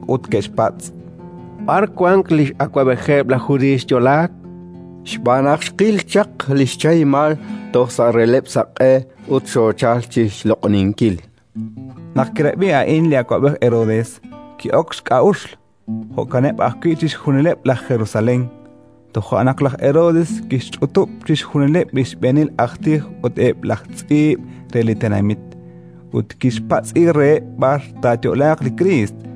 ut ke'xpatz': —B'ar wank li x'awab'ejeb' laj Judiiy xyo'laak? Xb'aan naq xqil chaq li xchahimal toj sa' releb'l saq'e ut xoochalk chi xloq'oninkil. Naq kirab'i a'in li awab'ej Herodes, ki'ok xk'a'uxl; jo'kaneb' ajwi' chixjunileb' laj Jerusalén. Toja' naq laj Herodes kixch'utub' chixjunileb' li xb'eenil aj tij ut eb' laj tz'iib' re li tenamit, ut kixpatz'i reheb' b'ar taayo'laaq li Kriist.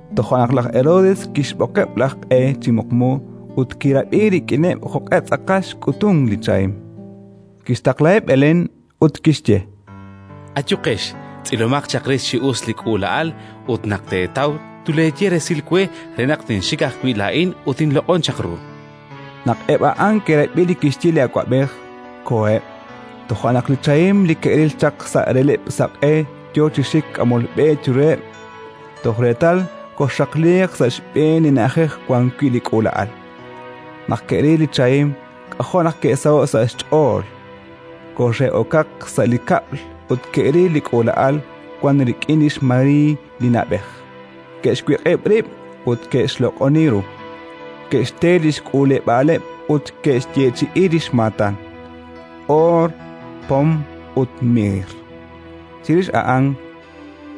Toja' naq laj Herodes kixb'oqeb' laj q'e chi muqmu ut kirab'i rik'ineb' jo'q'e tz'aqal xk'utunk li chahim. Kixtaqlaheb' Belén ut kixye: —Ayuqex, tz'ilomaq chaq rix chi us li k'uula'al ut, naq teetaw, tuleeye resil we re naq tinxik ajwi' laa'in ut tinloq'on chaq ru. Naq eb' a'an ke'rab'i li kixye li awab'ej, koheb'. Toja' naq li chahim li ke'ril chaq sa' releb'l saq'e yo chi xik k'amol b'e chiruheb', toj reetal koxxaqliiq sa' xb'een li na'ajej wan wi' li k'uula'al. Naq ke'ril li chahim, k'ajo' naq ke'saho'k sa' xch'ool! Koxe'okaq sa' li kab'l ut ke'ril li k'uula'al wank rik'in lix María li na'b'ej; ke'xwiq'ib' rib' ut ke'xloq'oni ru; ke'xte li xk'uuleb'aaleb' ut ke'xyeechi'i xmaatan: oor, pom ut miir. Chirix a'an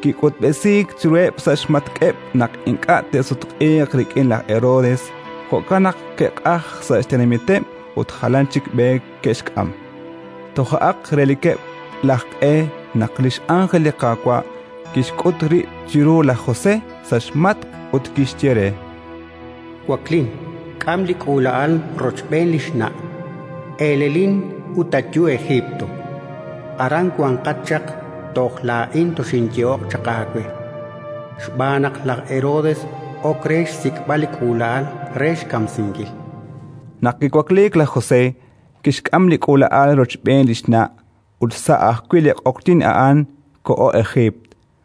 kik'utb'esiik chiruheb' sa' xmatk'eb' naq ink'a' te'sutq'iiq rik'in laj Herodes; jo'kan naq ke'q'ajk sa' xtenamiteb' ut jalan chik b'e ke'xk'am. Tojo'aq relikeb' laj q'e naq li x'angel li Qaawa' kixk'ut rib' chiru laj José sa' xmatk' ut kixye re: “Waklin, k'am li k'uula'al rochb'een li xna', elelin ut ayu Ejiipt. Aran wanqat chaq toj laa'in toxinyehoq chaq aawe, xb'aan naq laj Herodes ok re xsik'b'al li k'uula'al re xkamsinkil”. Naq kiwakliik laj José, kixk'am li k'uula'al rochb'een li xna' ut sa' ajwi' li q'oqyink a'an koho Ejiipt;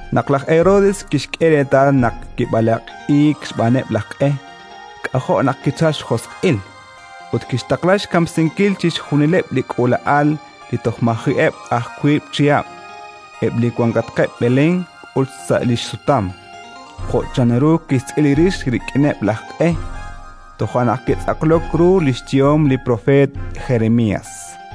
Naq laj Herodes kixk'e reetal naq kib'alaq'iik xb'aaneb' laj q'e, k'ajo' naq kichalk xjosq'il, ut kixtaqla xkamsinkil chixjunileb' li k'uula'al li toj maji'eb' aj wiib' chihab', eb' li wankatqeb' Belén ut sa' li xsutam, jo' chanru kixtz'il rix rik'ineb' laj q'e. Toja' naq kitz'aqlok ru li xyehom li propeet Jeremías: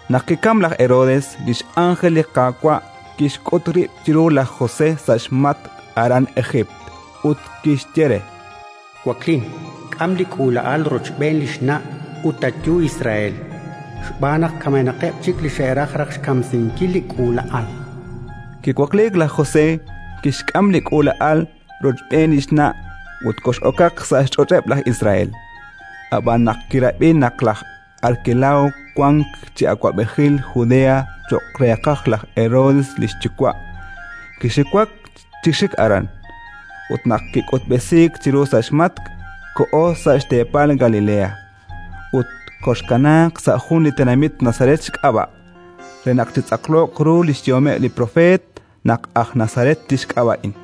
Naq kikamk laj Herodes, li x'ánjel li Qaawa' kixk'ut rib' chiru laj José sa' xmatk' aran Ejiipt ut kixye re: “Waklin, k'am li k'uula'al rochb'een li xna' ut ayu Israel, xb'aan naq kamenaqeb' chik li xe'raj raj xkamsinkil li k'uula'al”. Kiwakliik laj José, kixk'am li k'uula'al rochb'een li xna' ut kox'okaq sa' xch'och'eb' laj Israel. Ab'an naq kirab'i naq laj Arkelao wank chi awab'ejil Judea cho'q reeqaj laj Herodes li xyuwa', kixiwak chi xik aran. Ut naq kik'utb'esiik chiru sa' xmatk', koho sa' xteepal Galilea. Ut koxkanaaq sa' jun li tenamit Nazaret xk'ab'a', re naq chitz'aqloq ru li xyehomeb' li propeet naq aj Nazaret tixk'ab'a'in.